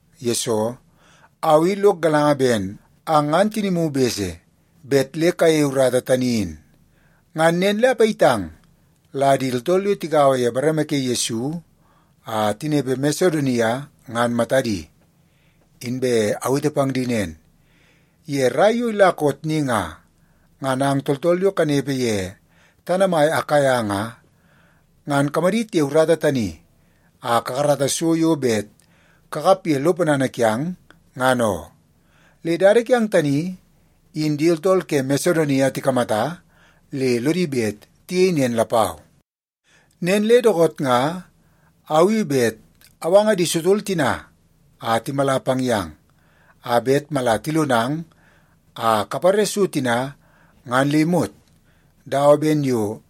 Yesoo, au i lok galanga ben ang ngan tinimu bese bet le kayeie urata tani in. Ngan nen le apayitang la di tooltool yo tigaua ye bareme ke Yesu a tinepe Masedonia ngan matadi. Inbe awete pang di nen, ye rai yo ila koot ni nga, ngan ang tooltool yo kanepe ye tana mai Akaia nga, ngan kamadit ye urata tani a kakarata so yo bet kakap ye lo ponana kiang, ngan oo. Le dada kiang tani, in di tooltool ke Masedonia tikamata le lodi bet tiyei nen lapau. Nen le dookoot nga au i bet awanga di sotol tina a timala pang yang, a bet mala tilonang a kapare so tina ngan le imot dawa ben yo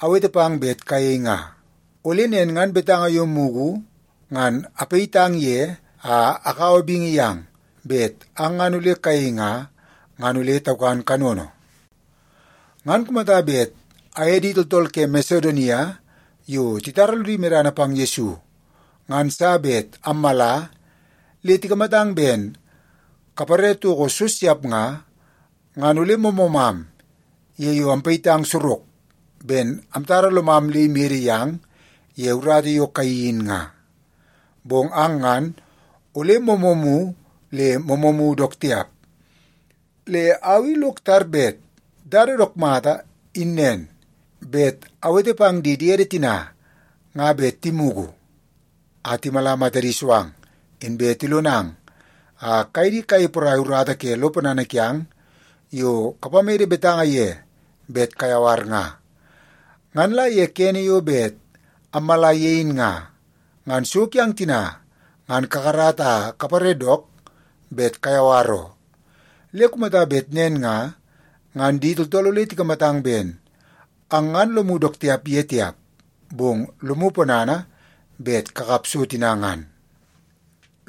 awete pang bet kayei nga. Ole nen ngan betanga yo mugu ngan apayitang ye a akaua bingi yang bet ang ngan ole kayei nga, ngan ole taukan kanono. Ngan kumata bet aye di tooltool ke Masedonia yo titara lodi medana pang Yesu ngan sa bet ammala le tikamatang ben kapare toko so siap nga, ngan ole moomoomam ye yo ampayitang sorok ben amtara lomam le imede yang ye urata yo kayeii in nga. Bong ang ngan ole moomoomu le moomoomu dook tiap. Le au i lok tar bet dada dook mata in nen, bet awete pang di diede tina nga bet timugu a timala matadi so ang, inbe tilonang a kaye di kayei porai urata ke lo ponana kiang yo kapamede betanga ye bet kayawar nga. Ngan la ye kene yo bet ammala ye in nga, ngan so kiang tina ngan kakarata a kapare dook bet kayawar oo. Le kumata bet nen nga, ngan di tooltool ole tikamatang ben ang ngan lomu dook tiap ye tiap, bong lomu ponana bet kakap so tina ngan.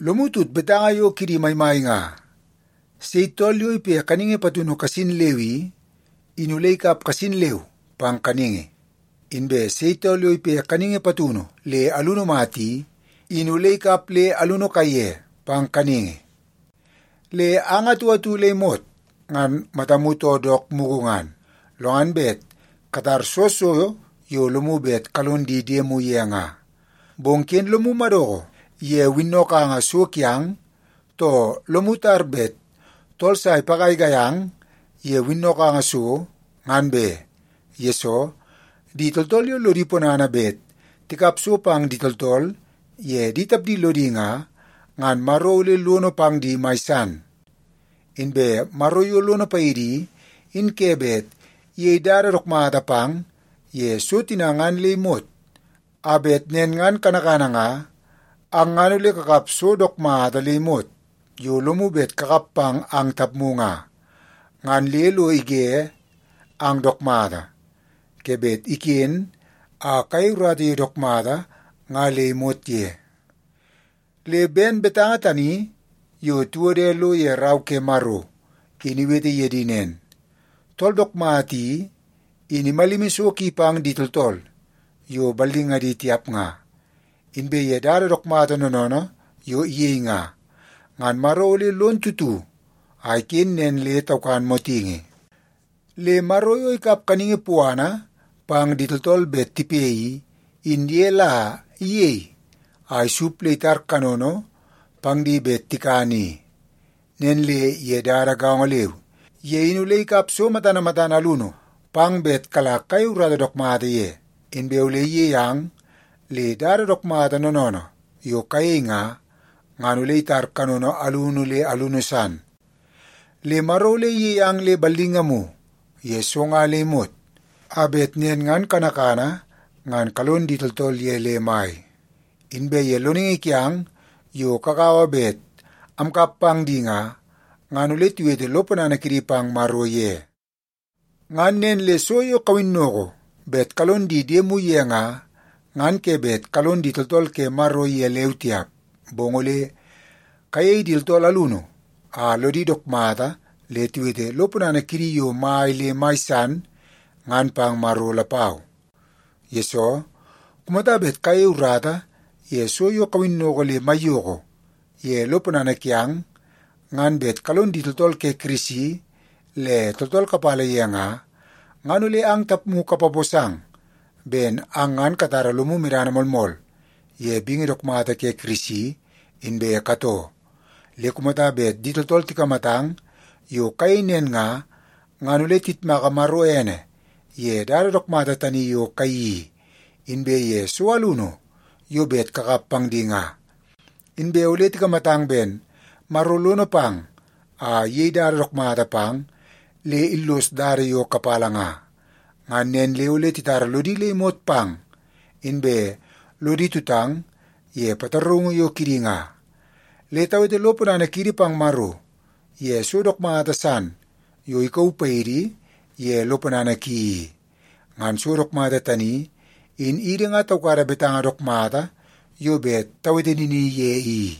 Lomu tut betanga yo kidi maimai nga, “Sei tool yo ipe kaningi patunu kasin leu i, in ole ikap kasin leu pang kaningi. Inbe sei tool yo ipe kaningi patunu le alunu mata i, in ole ikap le alunu kaiye pang kaningi.” Le ang atu atu le imot ngan matamu too dook mugu ngan, lo ngan bet katar soo so yo lomu bet kalong di diemu ye nga. Bong ken lomu madoko ye winnokanga so kiang, too lomu tar bet tool sa ipagaigai ang ye winnokanga so, ngan be, yesoo di tooltool yo lodi ponana bet tikap so pang di tooltool ye di tapdi lodi nga, ngan Maro ole lono pang di mai san. Inbe Maro yo lono paidi i, in ke bet iyei dada dook mata pang ye so tina ngan le imot, a bet nen ngan kanakana nga ang ngan ole kakap so dook mata le imot yo lomu bet kakap pang ang tapmu nga, ngan le lo ige ang dook mata ke bet iken a kayei urata yo dook mata nga le imot ye. Le ben betanga tani yo tiwode lo ye Rau ke Maro in iwete ye di nen, “Tool dook mata i, in imalimi so ki pang di tooltool yo ballingadi tiap nga. Inbe ye dada dook mata noonoonoo yo iyei nga, ngan Maro ole lon tutu a iken nen le taukan motingi.” Le Maro yo ikap kaningi puana pang di tooltool bet tipe i, in ye la iyei a isup le itar kanono pang di bet tikan i. Nen le ye dada gaongo leu, ye in ole ikap so matana matana alunu pang bet kala kayei urata dook mata ye, inbe ole iyei ang le dada dook mata noonoonoo yo kayei nga, ngan ole itar kanono alunu le alunu san. Le Maro ole iyei ang le ballingamu ye so nga le imot, a bet nen ngan kanakana ngan kalon di tooltool ye le mai. Inbe ye loningi kiang yo kagaua bet amkap pang di nga, ngan ole tiwete lo ponana kidi pang Maro ye. Ngan nen le so yo kawinnoko bet kalon di diemu ye nga, ngan ke bet kalon di tooltool ke Maro ye leu tiap, bong ole kayei di tooltool alunu a lodi dook mata le tiwete lo ponana kidi yo mai le mai san ngan pang Maro lapau. Yesoo, kumata bet kayei urata ye so yo kawinnoko le maiyoko ye lo ponana kiang ngan bet kalon di tooltool ke Kirisi le tooltool kapala ye nga, ngan ole ang tapmu kapaposang ben ang ngan katara lomu medana moolmool ye bingi dook mata ke Kirisi inbe katoo. Le kumata bet di tooltool tikamatang yo kayei nen nga, ngan ole tiyitmaka Maro ene ye dada dook mata tani yo kayeii i, inbe ye so alunu yo bet kakap pang di nga. Inbe ole tikamatang ben Maro lono pang a iyei dada dook mata pang le illos dada yo kapala nga. Ngan nen le ole titara lodi le imot pang, inbe lodi tutang ye pataraungu yo kidi nga. Le tawete lo ponana kiidi pang Maro ye so dook mata san yo ikauu paidi ye lo ponana ki i. Ngan so dook mata tani, in idi nga taukada betanga dook mata yo bet tawete nini ye i.